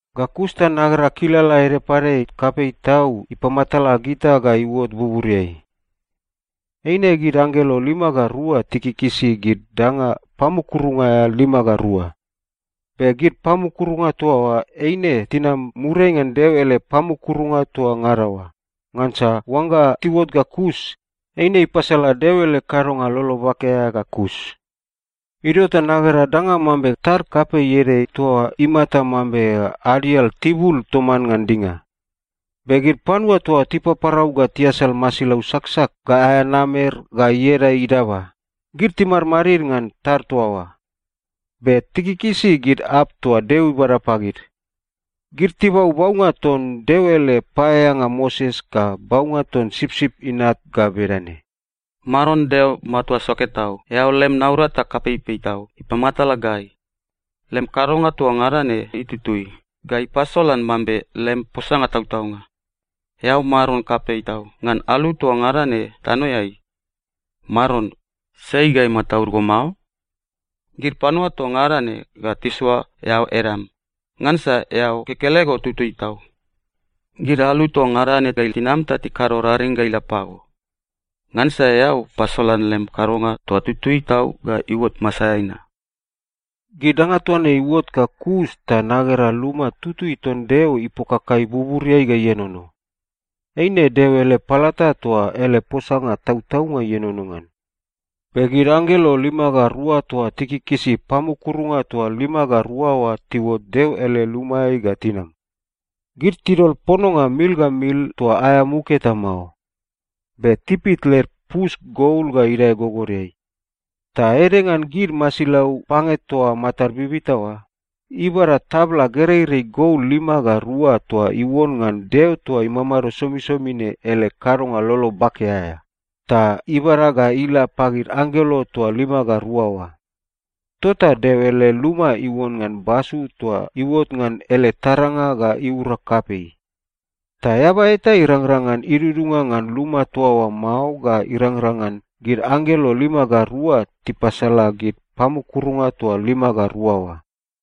Ga kus ta nagera kilala ede pade kapei tau ipamatala gita ga iuot buburiai. Eine gid anggelo lima ga rua tikikisi gid danga pamukurunga aea lima ga rua. Be gid pamukurunga toa oa eine tinam muriai ngan Deo ele pamukurunga toa ngada oa, ngansa oangga tiuot ga kus, eine ipasala Deo ele kadonga lolo bake aea ga kus. Idio ta nagera danga mambe tad kapei ede toa imata mambe adial tibul toman ngan dinga. Be gid panua toa tipaparau ga tiasal masilau saksak ga aea namer ga ieda idaba, gid timadmadid ngan tad toa oa. Be tikikisi gid arp toa Deo ibada pagid. Gid tibau baunga ton Deo ele paeaeanga Moses ga baunga ton Sipsip Inat ga bedane, “Maron Deo Matua Soke Tau, eao lem naurata kapeipei tau ipamatala gai. Lem kadonga toa ngada ne itutui ga ipasolan mambe lem posanga tautaunga. Eao Maron kapei tau ngan alu toa ngada ne tanoeai. Maron, sai ga imataud go mao? Gid panua toa ngada ne ga tisoa eao edam. Ngansa eao kekelego tutui tau. Gid alu toa ngada ne ga tinam ta tikado raring ga ila pago. Ngansa eao pasolan lem kadonga toa itutui tau ga iuot masaeai na.” Gid danga toa ne iuot ga kus ta nagera luma tutui ton Deo ipokakai buburiai ga ienono. Eine Deo ele palata toa ele posanga tautaunga ienono ngan. Be gid anggelo lima ga rua toa tikikisi pamukurunga toa lima ga rua oa tiuot Deo ele lumaeai ga tinam. Gid tidol pononga mil ga mil toa aea muk eta mao. Be tipit led pus gol ga idae gogodeai. Ta ede ngan gid masilau pange toa matad bibita oa, ibada tabla gereirei gol lima ga rua toa iuon ngan Deo toa imamado somisomi ne ele kadonga lolo bake aea, ta ibada ga ila pagid anggelo toa lima ga rua oa. Tota Deo ele luma iuon ngan basu toa iuot ngan ele taranga ga iura kapei. Ta eaba eta irangrang ngan idudunga ngan luma toa oa mao ga irangrang ngan gid anggelo lima ga rua tipasala gid pamukurunga toa lima ga rua oa.